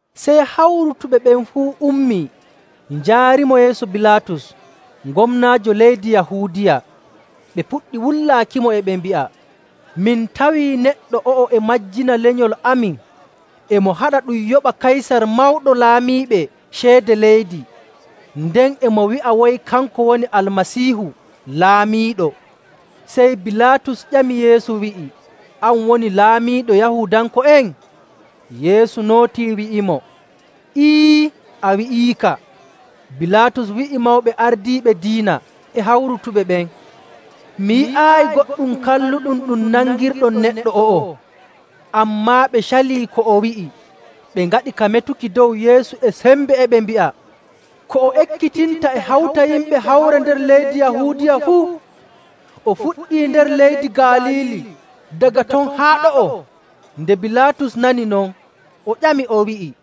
Sey hawrutuɓe ɓen fuu ummii, njaarimo yeeso Bilaatus, gomnaajo leydi Yahuudiya. Ɓe puɗɗi wullaakimo, e ɓe mbi'a, “Min tawii neɗɗo o'o e majjina lenyol amin. E mo haɗa ɗum yoɓa Kaysar Mawɗo Laamiiɓe ceede leydi, nden e mo wi'a way kanko woni Almasiihu, laamiiɗo.” Sey Bilaatus ƴami Yeesu wi'i, “An woni laamiiɗo Yahuudanko'en?” Yeesu nootii wi'imo, “Ee, a wi'iika.” Bilaatus wi'i mawɓe ardiiɓe diina e hawrutuɓe ɓen, “Mi yi'aayi goɗɗum kalluɗum ɗum nangirɗon neɗɗo o'o.” Ammaa ɓe calii ko o wi'i, ɓe ngaɗi ka metuki dow Yeesu e sembe, e ɓe mbi'a, “Ko o ekkitinta e hawta yimɓe hawre nder leydi Yahuudiya fuu. O fuɗɗii nder leydi Galiili, daga ton haa ɗo'o.” Nde Bilaatus nani non, o ƴami o wi'i,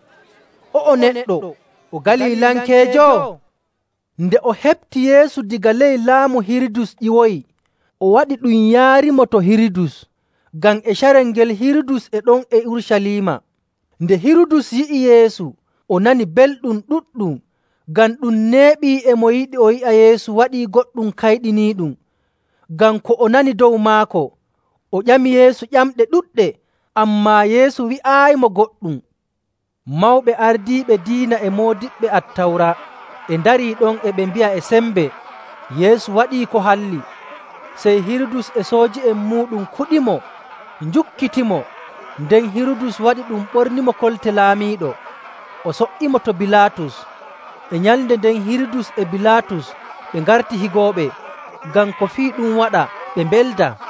“O'o neɗɗo o Galilankeejo?” Nde o heɓti Yeesu daga ley laamu Hirudus ƴiwoyi, o waɗi ɗum yaarimo to Hirudus, ngam e carel ngel Hirudus e ɗon e Urucaliima. Nde Hirudus yi'i Yeesu, o nani belɗum ɗuɗɗum, ngam ɗum neeɓii e mo yiɗi o yi'a Yeesu waɗii goɗɗum kayɗiniiɗum, ngam ko o nani dow maako. O ƴami Yeesu ƴamɗe ɗuɗɗe, ammaa Yeesu wi'aayimo goɗɗum. Mawɓe ardiiɓe diina e moodiɓɓe Attawra e ndarii ɗon e mbi'a e sembe Yeesu waɗii ko halli. Sey Hirudus e sooji'en muuɗum kuɗimo, njukkitimo, nden Hirudus waɗii ɗum ɓornimo kolte laamiiɗo, o so''imo to Bilaatus. E nyalnde nden Hirudus e Bilaatus ɓe ngarti higooɓe, ngam ko fii ɗum waɗa ɓe mbeldaa.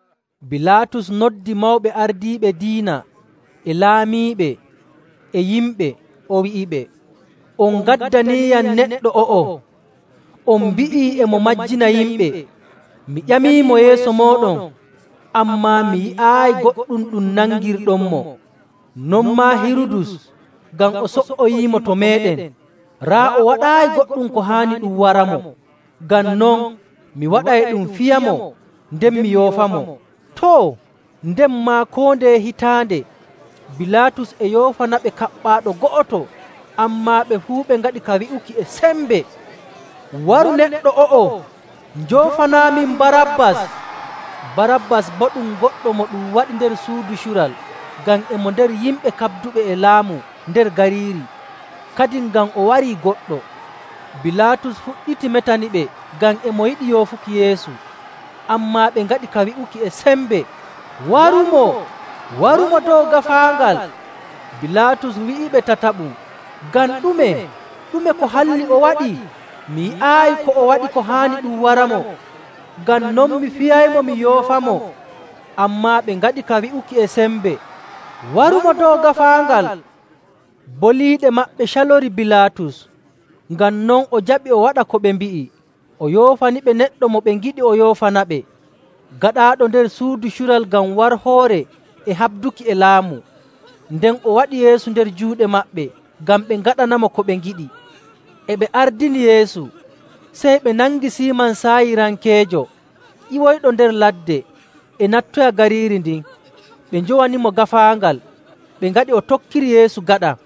Bilaatus noddi mawɓe ardiiɓe diina, e laamiiɓe, e yimɓe. O wi'iɓe, “On ngaddaniiyam neɗɗo o'o, on mbi'i e mo majjina yimɓe. Mi ƴamiimo yeeso mooɗon, ammaa mi yi'aayi goɗɗum ɗum nangirɗonmo. Non maa Hirudus, ngam o so''oyiimo to meeɗen. Raa, o waɗaayi goɗɗum ko haani ɗum waramo. Ngam non, mi waɗay ɗum fiyamo, nden mi yoofamo.” [Too, nden maa koo ndeye hitaande Bilaatus e yoofanaɓe kaɓɓaaɗo go'oto.] Ammaa ɓe fuu ɓe ngaɗi ka wi'uki e sembe, “Waru neɗɗo o'o. Njoofanaamin Barabbas!” Barabbas boo ɗum goɗɗo mo ɗum waɗi nder suudu cural ngam e mo nder yimɓe kaɓduɓe e laamu nder gariiri, kadin ngam o warii goɗɗo. Bilaatus fuɗɗiti metaniɓe ngam e mo yiɗi yoofuki Yeesu. Ammaa ɓe ngaɗi ka wi'uki e sembe, “Warumo! Warumo dow gaafaangal!” Bilaatus wi'iɓe tataɓum, “Ngam ɗume? Ɗume ko halli o waɗi? Mi yi'aayi ko o waɗi ko haani ɗum waramo. Ngam non, mi fiyaymo, mi yoofamo.” Ammaa ɓe ngaɗi ka wi'uki e sembe, “Warumo dow gaafaangal!” Boliiɗe maɓɓe calorii Bilaatus. Ngam non o jaɓi o waɗa ko ɓe mbi'i. O yoofaniɓe neɗɗo mo ɓe ngiɗi o yoofanaɓe, gaɗaaɗo nder suudu cural ngam warhoore e haɓduki e laamu. Nden o waɗi Yeesu nder juuɗe maɓɓe ngam ɓe ngaɗanamo ko ɓe ngiɗi. E ɓe ardini Yeesu, sey ɓe nangi Siiman Saayirankeejo ƴiwoyɗo nder ladde e nattoya gariiri ndin. Ɓe njowanimo gaafaangal, ɓe ngaɗi o tokkiri Yeesu gaɗa.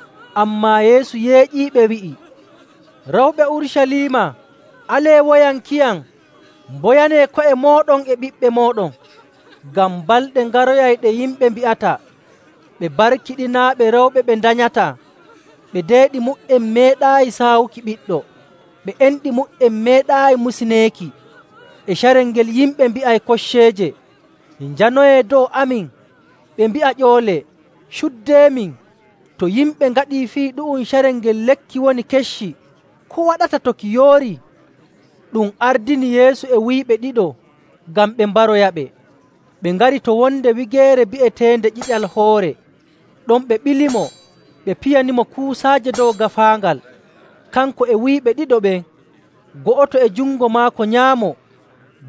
Ammaa Yeesu yeeƴiiɓe wi'i, “Rewɓe Urucaliima, alee woyankiyam, mboyanee ko'e mooɗon e ɓiɓɓe mooɗon. Ngam balɗe ngaroyay ɗe yimɓe mbi'ata, ‘Ɓe barkiɗinaaɓe rewɓe ɓe ndanyataa, ɓe deeɗi mu''en meeɗaayi saawuki ɓiɗɗo, ɓe enɗi mu''en meeɗaayi musineeki.’ E carel ngel yimɓe mbi'ay kocceeje, ‘Njanoyee dow amin!’ Ɓe mbi'a ƴoole ‘Cuuɗeemin!’. To yimɓe ngaɗii fii ɗu'um carel ngel lekki woni kecci, ko waɗata to ki yoorii?” Ɗum ardini Yeesu e wuyɓe ɗiɗo, ngam ɓe mbaroyaɓe. Ɓe ngari to wonde wigeere bi'eteende “Ƴiƴal Hoore.” Ɗon ɓe ɓilimo, ɓe piyanimo kuusaaje dow gaafaangal, kanko e wuyɓe ɗiɗo ɓen, go'oto e jungo maako nyaamo,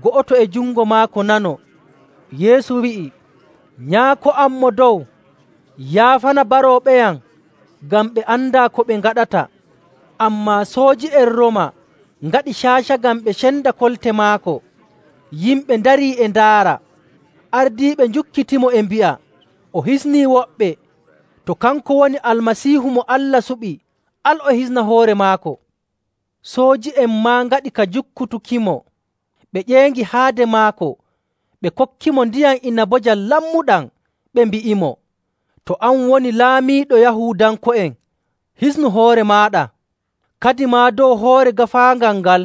go'oto e jungo maako nano. Yeesu wi'i, “Nyaako am Mo Dow, yaafana barooɓeyam ngam ɓe andaa ko ɓe ngaɗata.”. Ammaa sooji'en Rooma ngaɗi caaca ngam ɓe cenda kolte maako. Yimɓe ndarii e ndaara, ardiiɓe njukkitimo e mbi'a, “O hisnii woɓɓe. To kanko woni Almasiihu mo Allah suɓi, al o hisna hoore maako.”. Sooji'en maa ngaɗi ka jukkutukimo, ɓe ƴeeŋi haade maako, ɓe kokkimo ndiyam inabojam lammuɗam, ɓe mbi'imo,. “To an woni Laamiiɗo Yahuudanko'en, hisnu hoore maaɗa!” Kadimaa dow hoore gaafaangal ngal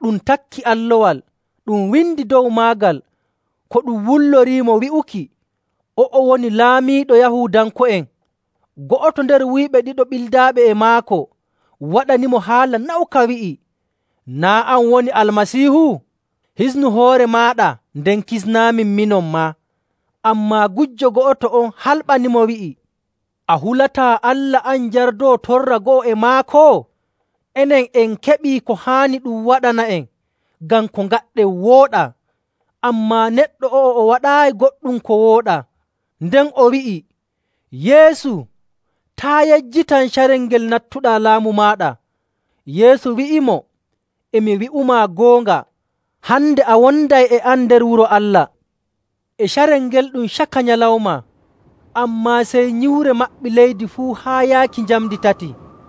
ɗum takki allowal. Ɗum windi dow maagal ko ɗum wulloriimo wi'uki, “O'o woni Laamiiɗo Yahuudanko'en.” Go'oto nder wuyɓe ɗiɗo ɓildaaɓe e maako waɗanimo haala nawka, wi'i, “Naa' an woni Almasiihu? Hisnu hoore maaɗa, nden kisnaamin, minon maa!” Ammaa gujjo go'oto on halɓanimo, wi'i, “A hulataa Allah, an jardoowo torra go'o e maako? Enen en keɓii ko haani ɗum waɗana'en, ngam ko ngaɗɗen wooɗaa. Ammaa neɗɗo o'o, o waɗaayi goɗɗum ko wooɗaa.” Nden o wi'i, “Yeesu, taa' yejjitam carel ngel nattuɗaa laamu maaɗa.” Yeesu wi'imo, “E mi wi'umaa goonga, hande a wonday e am nder Wuro Allah.” E carel ngel ɗum caka nyalawma, ammaa sey nyiwre maɓɓi leydi fuu haa yaaki njamndi tati,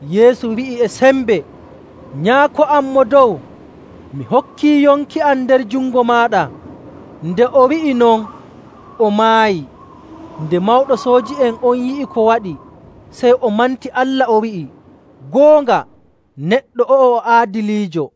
Yeesu wi'i e sembe, “Nyaako am Mo Dow, mi hokkii yonki am nder jungo maaɗa!” Nde o wi'i non, o maayi.. Nde mawɗo sooji'en on yi'i ko waɗi, sey o manti Allah, o wi'i, “Goonga, neɗɗo o'o o aadiliijo!”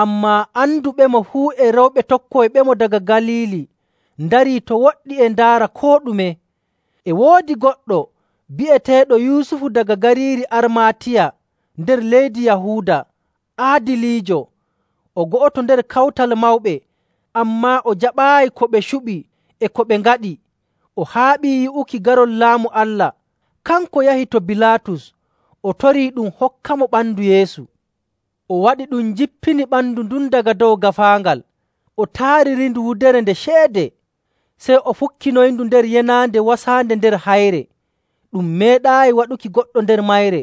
Ammaa anduɓemo fuu e rewɓe tokkoyɓemo daga Galiili ndarii to woɗɗi e ndaara koo ɗume.. E woodi goɗɗo bi'eteeɗo Yusufu daga gariiri Armaatiya nder leydi Yahuuda, aadiliijo. O go'oto nder Kawtal Mawɓe, ammaa o jaɓaayi ko ɓe cuɓi e ko ɓe ngaɗi. O haaɓii yi'uki garol Laamu Allah. Kanko yahi to Bilaatus, o torii ɗum hokkamo ɓandu Yeesu. O waɗi ɗum jippini ɓandu ndun daga dow gaafaangal, o taaririndu wudere nde ceede. Sey o fukkinoyindu nder yenaande wasaande nder hayre, ɗum meeɗaayi waɗuki goɗɗo nder mayre.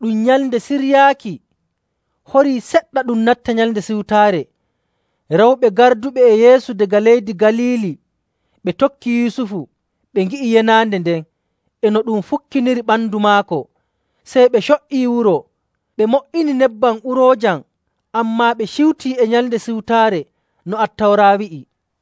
Ɗum Nyalnde Siryaaki: Waato Jummaare., horii seɗɗa ɗum natta Nyalnde Siwtaare. Rewɓe garduɓe e Yeesu daga leydi Galiili ɓe tokki Yusufu, ɓe ngi'i yenaande nden, e no ɗum fukkiniri ɓandu maako. Sey ɓe co''ii wuro, ɓe mo''ini nebbam uroojam, ammaa ɓe ciwtii e Nyalnde Siwtaare no Attawra wi'i..